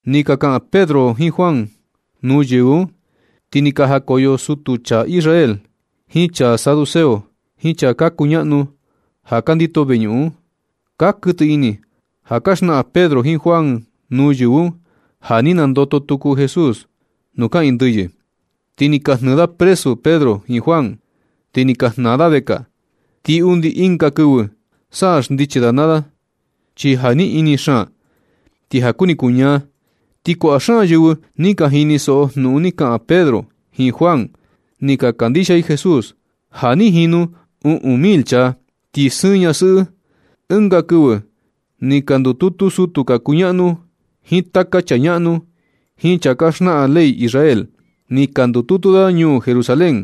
Nɨ ka kaꞌan Pedro jiin Juan nuu yɨvɨ un, ti ni ka jakoyo sutu chaa Israel, jiin chaa saduceo, jiin chaa ka kuñaꞌnu ja ka ndito veñuꞌun un. Ka kuɨtɨ ini ja ka xnaꞌan Pedro jiin Juan nuu yɨvɨ un ja ni nandoto tuku Jesús nuu kaꞌiin ndɨyɨ. Ti ni ka jnɨɨ da presu Pedro jiin Juan, ti ni ka jnaa da vekaa. Ti undi ɨnga kɨvɨ sa xndichi da naa da, chi ja ni ini xaan kuu, ti ja kuni kuñaa. Ti kuaꞌa xaan yɨvɨ ni ka jinisoꞌo jnuꞌun ni ka kaꞌan Pedro jiin Juan, ni ka kandixia i Jesús. Ja ni jinu uꞌun mil chaa, ti sɨɨn ñasɨꞌɨ. Ɨnga kɨvɨ ni ka ndututu sutu ka kuñaꞌnu, jiin taka chaa ñaꞌnu, jiin chaa ka xnaꞌan ley Israel. Ni ka ndututu da ñuu Jerusalén.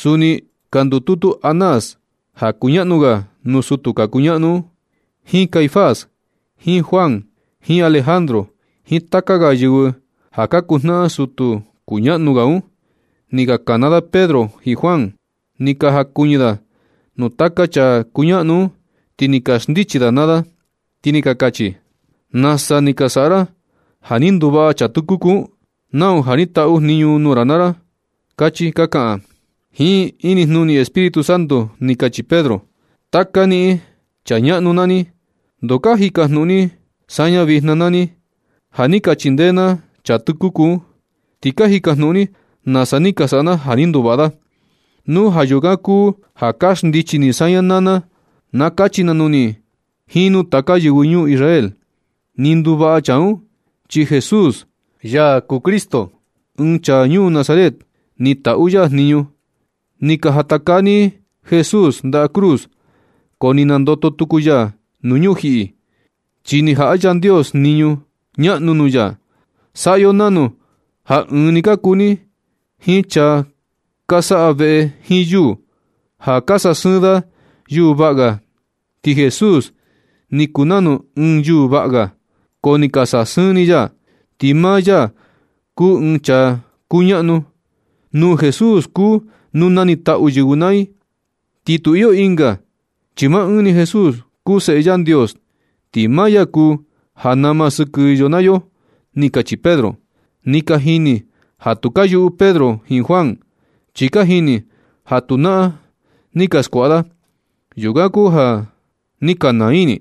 Suni ni ka ndututu Anás, ja kuñaꞌnu ga nuu sutu ka kuñaꞌnu un, jiin Caifás jiin Juan jiin Alejandro jiin taka ga yɨvɨ ja ka kuu jnaꞌan sutu kuñaꞌnu ga un. Ni ka kana Pedro jiin Juan, ni ka jakuñɨ da nuu taka chaa kuñaꞌnu un, ti ni ka xndichi da naa da, ti ni ka kachi: ―Nasa ni ka saꞌa ra ja ni nduvaꞌa chaa tɨkuku un. Nau ja ni taꞌu jniñu nuu ra naa ra ―kachi ka kaꞌan. Jiin inijnuni Espíritu Santo ni kachi Pedro: ―Taka niꞌin chaa ñaꞌnu naa ni, ¿ndoo ka jikajnuꞌun ni saña vijna naa ni, ja ni ka chindee na chaa tɨkuku un? Ti ka jikajnuꞌun ni nasa ni ka saꞌa na ja ni nduvaꞌa da. Nu ja yukan kuu ja ka xndichi ni saña naa na, na kachi na nuu ni jiin nuu taka yɨvɨ ñuu Israel. Ni nduvaꞌa chaa un, chi Jesús, ya kuu Cristo, ɨɨn chaa ñuu Nazaret, ni taꞌu ya jniñu. Ni ka jatakaa ni Jesús ndaꞌa cruz, ko ni nandoto tuku ya nuu ñujiꞌi, chi ni jaꞌa Yandios jniñu ñaꞌnu nuu ya. Saꞌa yo nanu ja ɨɨn ni ka kuu ni jiin chaa ka saꞌa veꞌe jiin yuu, ja ka sasɨɨn da yuu vaꞌa ga, ti Jesús ni kuu nanu ɨɨn yuu vaꞌa ga. Ko ni ka sasɨɨn ni ya, ti maa ya kuu ɨɨn chaa kuñaꞌnu. Nuu Jesús kuu nuu nanitaꞌu yɨvɨ naa i, ti tu iyo ɨnga, chi maa ɨɨn ni Jesús kuu Seꞌe Yandios, ti maa ya kuu ja nama sɨkɨ yo naa yo ―ni kachi Pedro. Ni ka jini ja tu ka yuꞌu Pedro jiin Juan. Chi ka jini ja tu naꞌan ni ka skuaꞌa da. Yukan kuu ja ni ka naa ini,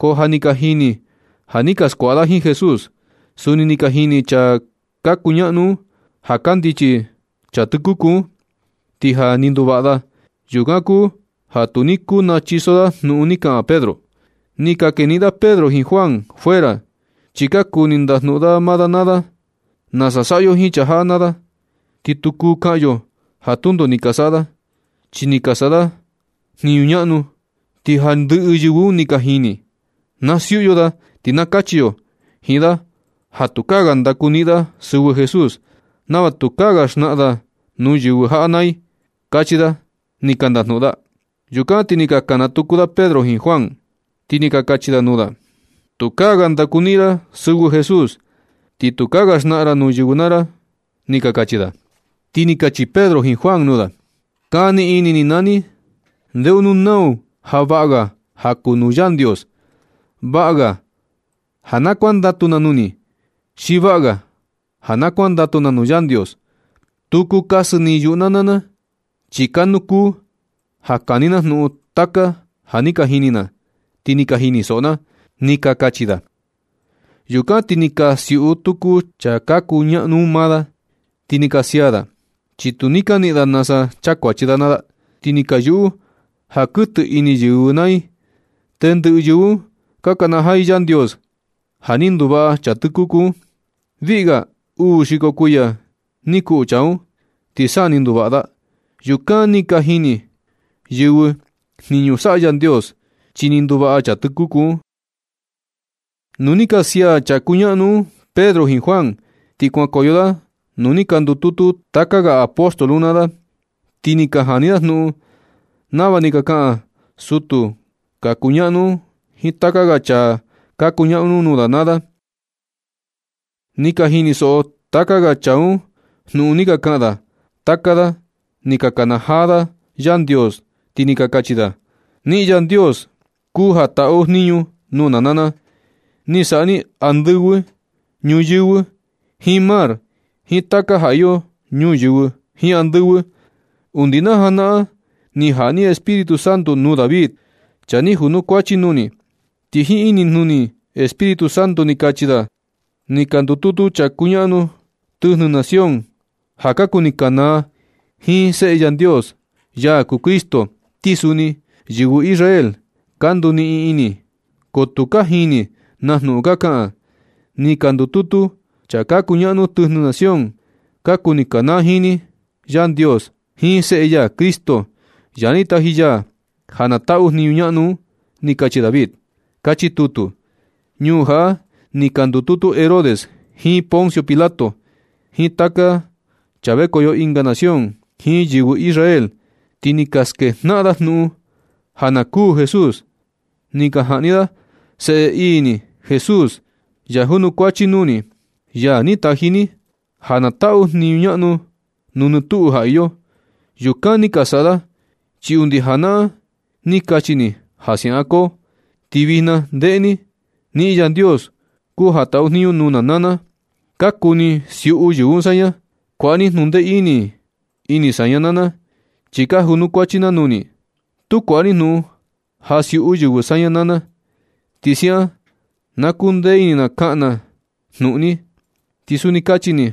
ko ja ni ka jini ja ni ka skuaꞌa da jiin Jesús. Suni ni ka jini chaa ka kuñaꞌnu un ja kandichi chaa tɨkuku un, ti ja ni nduvaꞌa da. Yukan kuu ja tu ni kuu nachiso da jnuꞌun ni kaꞌan Pedro. Ni ka keniꞌin da Pedro jiin Juan fuera chi ka kuni ndajnuꞌun maa da naa da: ―Nasa saꞌa yo jiin chaa jaꞌa naa da. Ti tu kuu kaꞌan yo ja tundo ni ka saꞌa da, chi ni ka saꞌa da jniñu ñaꞌnu, ti ja ni ndɨꞌɨ yɨvɨ ñuu jaꞌa ka jini. Na siuꞌu yo da, ti na kachi yo jiin da ja tukaa ga ndakuniꞌin da sɨvɨ Jesús, nava tukaa ga xnaꞌan da nuu yɨvɨ jaꞌa naa i ―kachi da ni ka ndajnuꞌun da. Yukan ti ni ka kana tuku da Pedro jiin Juan, ti ni ka kachi da nuu da: ―Tukaa ga ndakuniꞌin ra sɨvɨ Jesús, ti tukaa ga xnaꞌan ra nuu yɨvɨ naa ra ―ni ka kachi da. Ti ni ka kachi Pedro jiin Juan nuu da: ―Kani ini ni naa ni. Ndeo nuu nau ja vaꞌa ga ja kuu nuu Yandios. Vaꞌa ga ja kuandatu na nuu ni, xi vaꞌa ga ja kuandatu na nuu Yandios. Tu kuu kasɨ yuꞌu na naa na, chi kanu kuu ja kani na jnuꞌun taka ja ni ka jini na, ti ni ka jinisoꞌo na ―ni ka kachi da. Yukan ti ni ka siuꞌu tuku chaa ka kuñaꞌnu un maa da. Ti ni ka sia da, chi tu ni ka niꞌin nasa chakuachi da naa da. Ti ni ka yuꞌu ja kuɨtɨ ini yɨvɨ naa i. Tendɨꞌɨ yɨvɨ un ka kanajaa i Yandios ja ni nduvaꞌa chaa tɨkuku un. Viꞌi ga uu xiko kuiya ni kuꞌu chaa un, ti sa ni nduvaꞌa da. Yukan ni ka jini yɨvɨ jniñu saꞌa Yandios, chi ni nduvaꞌa chaa tɨkuku un. Nu ni ka sia chaa ka kuñaꞌnu un Pedro jiin Juan, ti kuankoyo da nuu ni ka ndututu taka ga apóstol un naa da. Ti ni ka jani da jnuꞌun nava ni ka kaꞌan sutu ka kuñaꞌnu un jiin taka ga chaa ka kuñaꞌnu un nuu da naa da. Ni ka jinisoꞌo taka ga chaa un jnuꞌun ni ka kaꞌan da, taka da ni ka nakanajaa da Yandios, ti ni ka kachi da: ―Niꞌin Yandios kuu ja taꞌu jniñu nuu na naa na. Ni saꞌa ni andɨvɨ, ñuyɨvɨ, jiin mar, jiin taka ja iyo ñuyɨvɨ, jiin andɨvɨ. Undi najanaꞌan ni jaꞌa ni Espíritu Santo nuu David, chaa ni junukuachi nuu ni. Ti jiin inijnuni Espíritu Santo ni kachi da: Ni ka ndututu chaa ka kuñaꞌnu tɨjnɨ nación ja ka kuni kanaa jiin Seꞌe Yandios, ya kuu Cristo. Ti suni yɨvɨ Israel ka nduniꞌin ini, ko tu ka jini na jnuꞌun ka kaꞌan. Ni ka ndututu chaa ka kuñaꞌnu tɨjnɨ nación. Ka kuni kanaa jiin ni, Yandios jiin Seꞌe ya Cristo, ya ni taji ya ja na taꞌu jniñu ñaꞌnu un, ni kachi David. Kachi tutu. Ñuu jaꞌa ni ka ndututu Herodes, jiin Poncio Pilato, jiin taka chaa vekoyo ɨnga nación, jiin yɨvɨ Israel, ti ni ka skejnaꞌan da jnuꞌun ja na kuū Jesús, ti ni ka jaꞌni da Seꞌe ii ni Jesús, ya junukuachi nuu ni, ya ni taji ni ja na taꞌu jniñu ñaꞌnu nuu nɨ tuꞌu ja iyo. Yukan ni ka saꞌa da, chi undi janaꞌan ni kachi ni ja siaꞌan koo. Ti vijna ndeꞌe ni, niꞌin Yandios kuu ja taꞌu jniñu nuu na naa na. Ka kuni siuꞌu yɨvɨ saña. Kuaꞌa ni jnuꞌun ndee ini saña naa na, chi ka junukuachi na nuu ni. Tu kuaꞌa ni jnuꞌun ja siuꞌu yɨvɨ saña naa na. Ti siaꞌan na kundee ini na kaꞌan na jnuꞌun ni. Ti suni kachi ni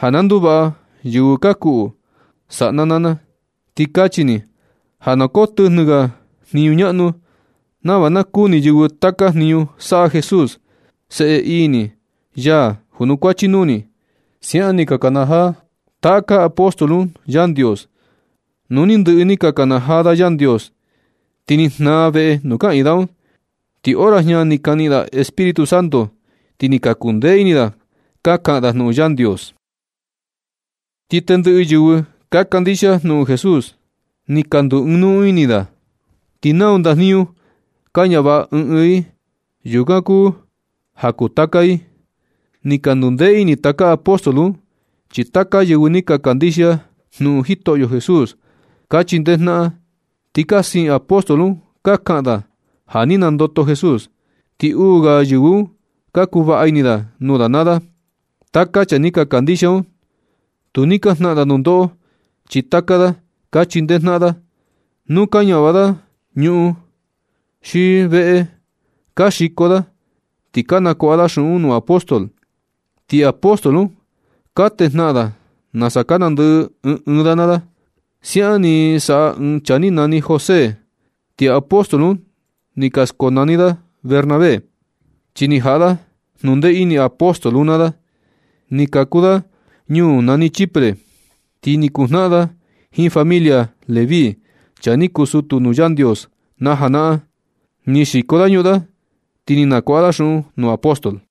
ja na nduvaꞌa yɨvɨ ka kuꞌu, saꞌa na naa na. Ti kachi ni ja na koo tɨjnɨ ga jniñu ñaꞌnu, nava na kuni yɨvɨ taka jniñu saꞌa Jesús, Seꞌe ii ni, ya junukuachi nuu ni ―siaꞌan ni ka nakanajaa taka apóstol un Yandios. Nu ni ndɨꞌɨ ni ka nakanajaa da Yandios, ti ni jnaa veꞌe nuu kaꞌiin da un. Ti hora jña ni ka niꞌin da Espíritu Santo, ti ni ka kundee ini da ka kaꞌan da jnuꞌun Yandios. Ti tendɨꞌɨ yɨvɨ ka kandixia jnuꞌun Jesús ni ka ndu ɨɨn nuu ini i. Ti nau ndajniñu ka ñavaꞌa ɨɨn ɨɨn i, yukan kuu ja kuu taka i. Ni ka ndundee ini taka apóstol un, chi taka yɨvɨ ni ka kandixia jnuꞌun Jitoꞌyo Jesús, ka chindee jnaꞌan. Ni ka siin apóstol un ka kaꞌan da ja ni nandoto Jesús. Ti uu ga yɨvɨ un ka kuu vaꞌa ini nuu da naa da. Taka chaa ni ka kandixia un, tu ni ka jnaꞌan da nundoꞌo, chi taka da ka chindee jnaꞌan da. Nu ka ñavaꞌa da ñuꞌun xi veꞌe, ka xiko da ti ka nakuaꞌa da xuꞌun nuu apóstol. Ti apóstol un ka tejnaꞌan da nasa ka nandɨꞌɨ ɨɨn ɨɨn da naa da. Siaꞌan ni saꞌa ɨɨn chaa ni nani José. Ti apóstol un ni ka na skonani da Bernabé, chi ni jaꞌa da jnundee ini apóstol un naa da. Ni kaku da ñuu nani Chipre, ti ni kuu jnaꞌan da jiin familia Leví, chaa ni kuu sutu nuu Yandios najanaꞌan. Ni xiko da ñuꞌun da, ti ni nakuaꞌa da xuꞌun nuu apóstol.